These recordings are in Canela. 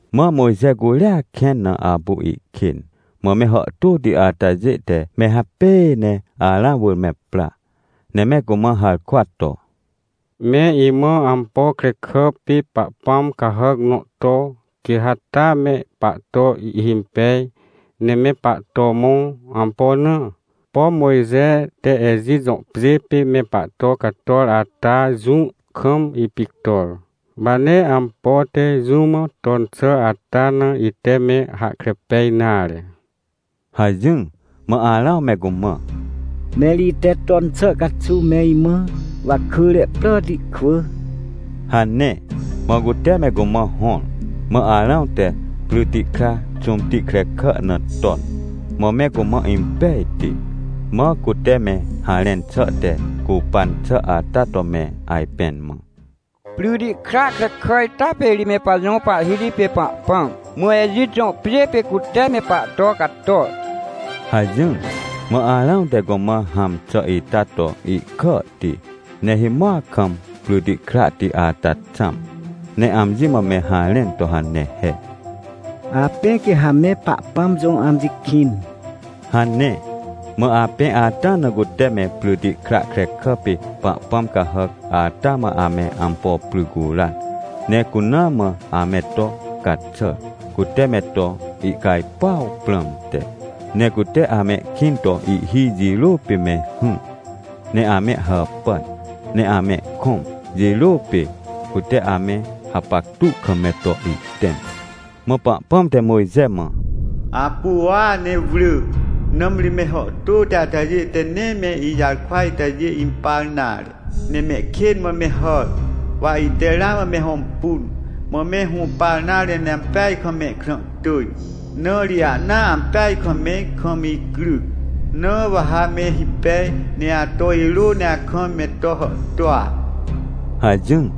Mã Mojxe curia kẽn na apu ihkên, mã me hàhtôti atajê te me hapêê neArãw wỳr me pra, ne me cumã harkwa to: — Me imã ampo krekà pê pahpãmcahàc nõ to, quê ha taa me pahto ihhimpej, ne me pahto mõ. Ampo na? Pom Mojxete Ejit jõ pjê pê me pahto cator ata jũ kam ipictor. Wa nee ampo te jũmã ton xà ata na ite me hahkre pej nare — hajỹr. Mã Arãw me cumã: — Mẽr ite ton xà caxuw me imã wakỳre pràti kwỳ — hane. Mã cute mecumã hõr, mã Arãw tepryti kra xũmti krekà na ton. Mã me cumã impejti, mã cute me harẽnxà te cupan xà ata to me ajpẽn mã: — Pryti kra krekà ita pê ri me pajõ pahhiti pêpahpãm, mã Ejit jõ pjê pê cute me pahto cator — hajỹr. Mã Arãw te cumã hãm xà ita to ihkàhti, ne himoac kam pryti krahti ata xãm, ne amji mã me harẽn to hane he: — Apẽ quê ha me Pahpãm jõ amji kĩn — hane. Mã apẽ ata na cute mepryti kra krekà pê pahpãm cahàc ata mã ame ampo pry curan, ne cuna mãame to caxàr, cute me to ihcajpuaw prãmte. Ne cute amehkĩn toihhi jirô pê me hỹr, ne ame hàpàn neamehkõm jirô pê, cute ame hapactu kam me to ihtẽm. Mã Pahpãm te Mojxe mã: — Apu uua ne wrỳ, nãmri me hàhtôti atajê te nee meijarkwa itajê impar nare, nemehkên mã me hàr. Wa ite ramã me hõmpun, mã me hũpar nare ne ampeajkam mehkrã tỳj, na ri ahna ampeaj kam me kam icryc. Na wa ha me hipej, ne ato irô ne akam me to hàhtôa — hajỹr.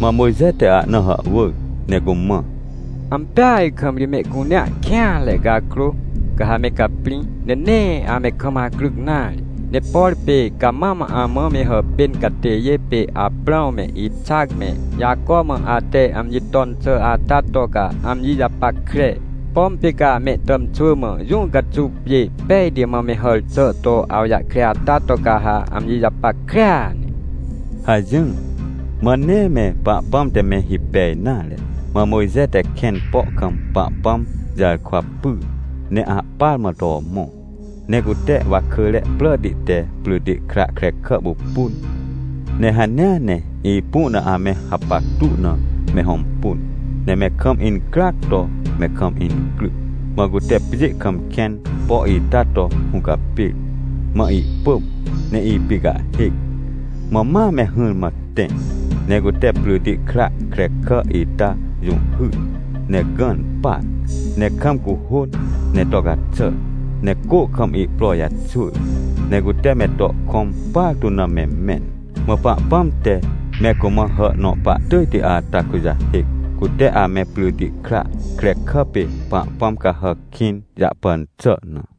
Mã Mojxe te ahna hàhwỳr ne cumã: — Ampeaj kam ri mehcunea kêanre cakrô, ca ha me caprĩ, ne nee ame kam acryc nare. Ne por pê ca mam amã me hàpên catêjê pê Aprãwme, Ixac me, Jaco mã ate amji ton xà ata to ca amji japackre. Pom pê camehtàmxwỳ mã jũ caxuw pjêpejti mã me hàr xà to awjahkre ata to, ca ha amji japackrea ne — hajỹr. Mã nee me Pahpãm te me hipej nare, mã Mojxe tekẽn po kam Pahpãm jarkwa pyr ne ahpar mã to mõ. Ne cutewakỳre pràti te pryti kra krekà pupun, ne hanea ne ipu na ame hapactu na me hõmpun, ne mekam incryac to me kam incryc. Mã cute pjê kam kẽn po ita to hũcapêr, mã ihpỳm ne ipicahhêc. Mã ma me hỹrmã tẽ, ne cute pryti kra krekà ita jũhhyr ne gãn par, ne kam cuhôn ne to caxàr, ne cô kam ihpro jaxwỳr, ne cute me to kõmpartu na me mẽn. Mã Pahpãm te me cumã hà nõ pahtỳjti ata kujahêc, cute amepryti kra krekà pê pahpãm cahàc kĩn jahpan xà na.